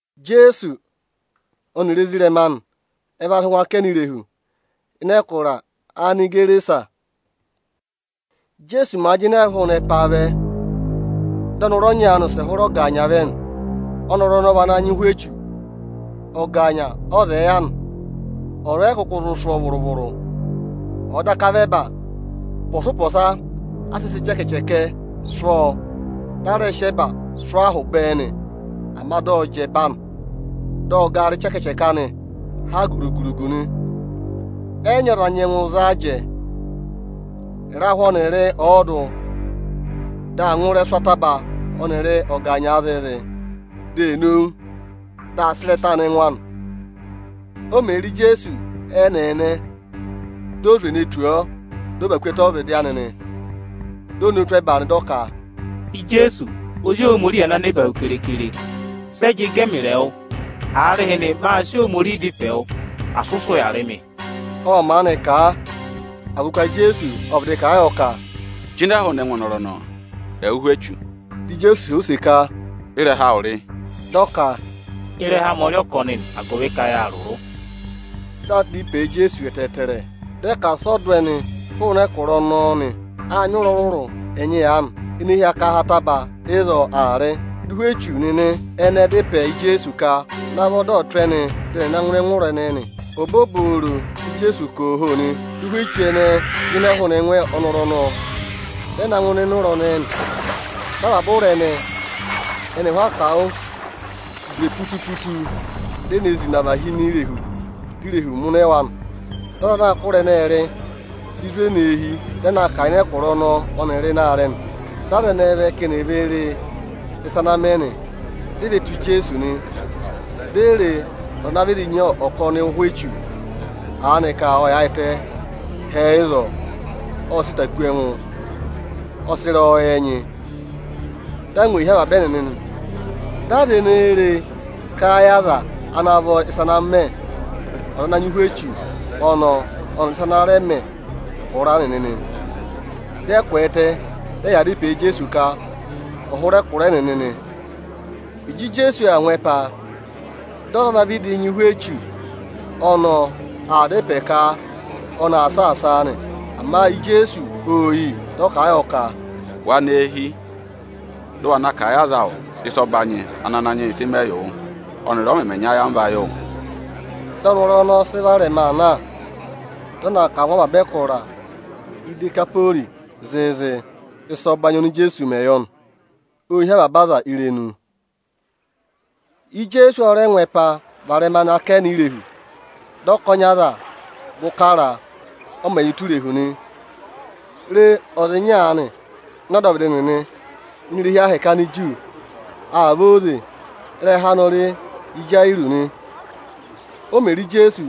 Ijeesu ọnịrị ezirẹma anị ẹ va sị ngụ akẹnẹ irehu, ịnị ẹkụra Anigerasa. Íjeesu màa jịnẹẹ hụụ nị ẹpaa vẹ, dị ọnọrụ ọnya aanị wụsẹ hụrẹ ọgaanya vẹ nị. Ọnọrụ ọnọọ vị ana nyị ụhwẹ echu. Ọgaanya ọọ̄ zẹẹ yà nị. Ọza ọ yị kụkụ zụ sụ́ ọọ vụrụ-vụrụ, ọ̀ọ daka vị ẹba. Ụpọọpọsa a sịị̄ sị ịchẹkẹchẹkẹ sụ́ ọọ, dị a rẹ sị ẹba sụ́ ọọ ahụ bẹẹ nị; ama dị ọ jị ẹba anị, dị ọ gara ịchẹkẹchẹkẹ anị ha rugu-rugu nị. Ẹ yị nyị ọza ana nyẹngụ za a jẹẹ. Ịrahụ ọnịrị ọọdụ dị aa ngụ ịrẹsụ ataba ọnịrị ọgaanya zịịzị, dị eē nowu, dị aā sị ịrẹtaa na ẹngụ anị. O mè re Ijeesu ẹ́nẹẹnẹ, di o zwe ne tù ọọ, dị ọ và ku ẹtẹ ọ́vịdị anị nị. Di o nowu tụ́ ẹba nị, dị ọ ka, “Ijeesu, Ozi Ohomorihi ana ya ẹbẹẹba keekere, sẹ jị gẹ ẹmịrị ẹwụ? Aarịhịnị, mâ sị Ohomorihi dá ịpẹ wụ, asị ụ sị ụya rị mị!” Ộ maanị kà, agụvị ka Ijeesu ộ vịdị kà a yọ ka, “jịnẹ hụụnị ẹngụ ọnọrụ ọnọọ, ẹwụ ụhwẹ echu!” Dị Ijeesu họ̀ ọ use ka, “Ị́rẹha awụ rị?” Dị ọ ka, “Ịrẹha amị ọ rị ‘Ọkọnị’ nị, agụvị ka yâ rụrụ.” Dị aa dá ịpẹẹ yị Ijeesu ẹtẹẹtẹrẹ, dị ẹ ka asị ọ dụ ẹnị hụụnị ẹkụra ọnọọ nị. Â nyị ụ̀rá ọrụrụ ẹnyị aanị, ene hi akaha ataba ịzọọ aa rị. Dị ụhwẹ echu nịnị ẹnẹẹ dá ịpẹ yị Ijeesu ka ọ̀ navọ dị ọ̀ tụ́ ẹnị dị ẹnị ẹ̀ na ngụ ịnị ụra ẹnẹẹ nị. Obooboro dị Ijeesu ka: Ooho! nị, dị ụhwẹ echu ẹnẹẹ jịnẹ hụụnị ẹngụ ọnọrụ ọnọọ, dị ẹ na ngụ ịnịnẹ ụra ẹnẹẹ nị. Dị avaba ụra ẹnẹẹ, ẹnị ẹhụụ akawụ, zwe putu-putu, di e ne zina và hi ini irehu, di irehu mụnẹ wa nị. Aza anaā kụ́ ụra ẹnẹẹ rị ê zwe nọ eehi, dị ẹ na kà a ịnị ẹkụra ọnọọ ọnịrị ịnị aarẹ nị. Dị aza vẹ ka eni è ve re ịsa ana mẹ nị. Ẹnịnị ê ve tù Ijeesu, di e re ọza ana vịdị nyị ọkọnị ụhwẹ echu aanị ka ộ yaayịtẹ hẹẹ ịzọọ, ộ sị ịta kú ẹngụ, ọ sị ịrẹyọyẹ nyị nị. Dị angwa ee hí avaba ẹnịnị nị. Aza ene re e, ệ kà a yị aza ana vọ ịsa ana mẹ ọza ana nyị ụhwẹ echu ọnọọ, ọnịrị ịsa ana rẹ mẹ ụra ẹnẹẹ. Dị ẹ kwẹẹtẹ, dị ẹ yaa dá ịpẹẹ yị Ijeesu ka ọ̀ hụrẹ ẹkụra ẹnịnị nị. Ịjị Ijeesu aa ngụ ẹpa, dị ọza ana vịdị nyị ụhwẹ echu ọnọọ, aa dá ịpẹ ka ọnị aa saasaa nị. Ama Ijeesu ô yi, dị ọ kà a yọ ka, “Wa nọ eehi, dị ụ wa na kà a yị aza awụ ịsa ọbanyị ana Ananyị yị sị mẹ yị wụ ọnịrị ọ mẹmẹ nyị ayamva yị wụ!” Dị ọnọrụ ọnọọ sị varẹma aa na, dị ọ na a kà a ngụ avaba ẹkụra Idekaporii zịịzị, ịsa ọbanyị oni Ijeesu mẹ yọ nị. Ô hí avaba aza irenu. Ijeesu ọ rẹ ngụ ẹpa varẹma nọ akẹnẹ irehu. Dị ọkọnị aza gụ kara a, ọ mẹ̀ yà ụtọ irehu nị. Re, ọza ịnya aanị ịnị ọdọvịdị irehi ahẹkẹ Aniju nịnị ộ vẹ. Ịrẹha anị ọ rị Ịjayịrọọsị nị. O mè re Ijeesu,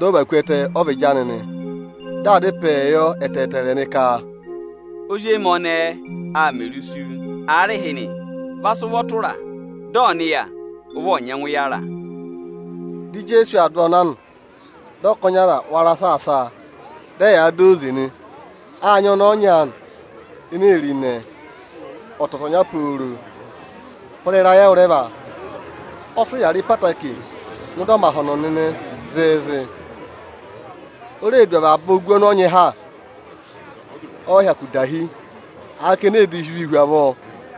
dị ọ và ku ẹtẹ ọ́vịdị anị nị. Dị aa dá ịpẹẹ yọ ẹtẹẹtẹrẹ nị ka, “Ozi emi ọnẹẹ aa mẹrị isu. Aarịhịnị, va sị ụvọ tụra a, dị ẹngụ anị ọ̀ nịya ụvị ọ̀ nyẹngụ yàra!” Dị Ijeesu aa dụ ọọ na nị. Dị ọkọnị aza rẹ wara saasa a, dị ẹyaa dọ ọ óze eyi ẹnyị eyi ọsa nị. Â nyị ọnẹẹ ọnya aanị ene ee re ịnẹ ọtọtọnya pooro hụrẹ ịrayị ẹwụrẹva. Ọ sị ụya rị ẹtẹẹtẹrẹ ngụ ịdị ọmahọnọ nịnị zịịzị. O reè du avaba ogu ọnị ọ nyị ha, ọ yị hyakụ dahi, aaka ene ee divii hu avọọ.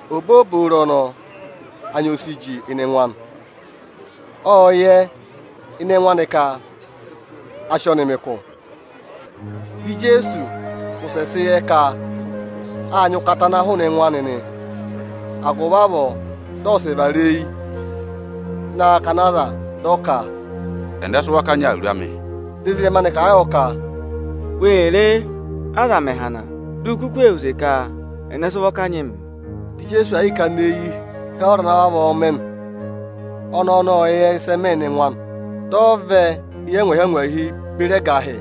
Obooboro ọnọọ anya o si jị ịnị ẹngụ anị. Ộ yẹ ịnị ẹngụ anị ka a sị ọnị mẹ ụkụ. Dị Ijeesu wụsẹ sị yẹ ka â nyị ụkata ana hụụnị ẹngụ anị nị. Agụvị avọọ dị ọ wụsẹ vara eyi ịnị akakana aza, dị ọ ka, “Ẹnẹ sị ụvọ kanyị awuru amị?” Dị ezirẹma anị kà a yọ ka, “Wê re, aza mẹ̀ hana, di u kuku ee họ̀ use ka: Ẹnẹ sị ụvọ kanyị mịị?” Dị Ijeesu aa yịị kana eyi hee ọza ana vavọọ mẹ nị. Ọnẹẹ ọnọọ ộ yẹ ịsị ẹ mẹ ịnị ẹngụ anị, dị ọ vẹ eyi angwahi-angwahi beri ẹgahị,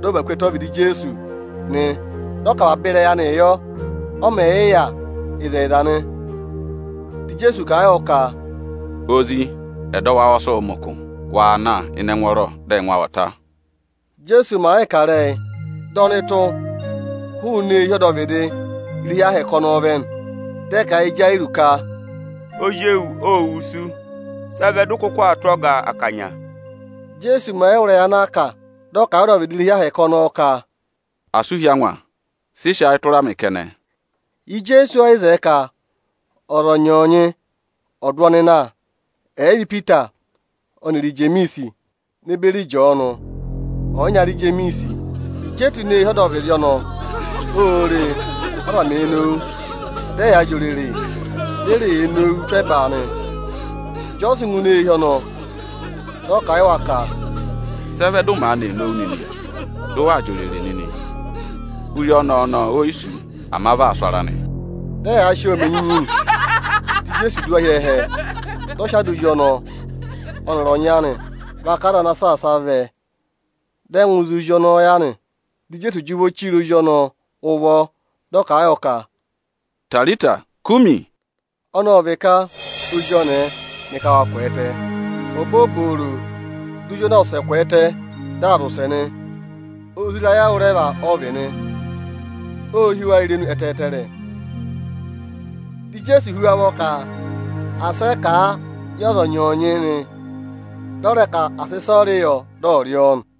dị ọ và ku ẹtẹ ọ́vịdị Ijeesu nị. Dị ọ kà avaba ịrẹyị anịị yọ, ọ mẹ̀ yị yà ịzẹyịza nị. Dị Ijeesu kà a yọ ka, “Ozi, ẹdọwụ awụ ọ sị wụ mẹ ụkụ, waa na ịnị ẹngwọọrọ, dị ẹngụ awụ ọ̀ ta!” Íjeesu màa yịị kà ịrẹyị, dị ọnụtụ hụụnị eehi ọdọvịdị irehi Ohomorihi ọnọọ vẹ nị. Dị ẹ kà a yị Ịjayịrọọsị ka, “Ozi ewu ô wusu, sị ẹ vẹ dị ụ kụkụ aa tụ́ Ọga akanya?” Íjeesu mẹ̀ yị wụ́ ịrẹyị ana a kà, dị ọ kà a yị ọdọvịdị irehi Ohomorihi ọnọọ ka, “Asị u hí angwa, sị sị ayị tụra mị kẹnẹ!” Ijeesu ẹ yị zẹẹ ka ọza ọnyọọnyị ọ̀ dụ ọnị na, ẹ̀ yị vị Ipita ọnịrị Ijemiisi ne beri Ịjọọnụ, ọyịnyara Ijemiisi. Ịjị e tù ini eehi ọdọvịdị ọnọọ, ô re, aza mèe nowu, dị ẹyaa jị òrèrè di e ree nowuu tụ́ ẹba nị. Ịjị ọ sị ngụ ini eehi ọnọọ, dị ọ kà a yị wa ka, “Sị ẹ vẹ dị ụ maanị ee nowu nịnị, dị ụ waa jị òrèrè nịnị? Ozi ọnẹẹ ọnọọ o yi sú, ama vị aa sụ ara nị.” Dị ẹyaa sị ọọ mẹ enyinyi nị. Dị Ijeesu dụ wa hi ẹhẹ, dị ọ sị ada ozi ọnọọ ọnịrị ọnyị anị, vaka aza ana saasa a vẹ, dị ẹ ngụ ịzị ozi ọnọọ ya nị. Dị Ijeesu jị ụvọ chire ozi ọnọọ ụvọ, dị ọ kà a yọ ka, “Itarita kumi”, ọnọọ vị ka, “Ozi ọnẹẹ, mị ka wa kwẹẹtẹ!” Obooboro, di ozi ọnọọ wụsẹ kwẹẹtẹ, dị aa zị ụsẹ nị. Ozi ịrayị ẹwụrẹva ọ vị nị. Ô hí wa irenu ẹtẹẹtẹrẹ. Dị Ijeesu hú wa ụvọ ka asị ẹ kà a yị ọza ọnyọọnyị nị, dị ọ rẹ ka à sị ịsọyịrị yọ dị ọ̀ rị ọọ nị.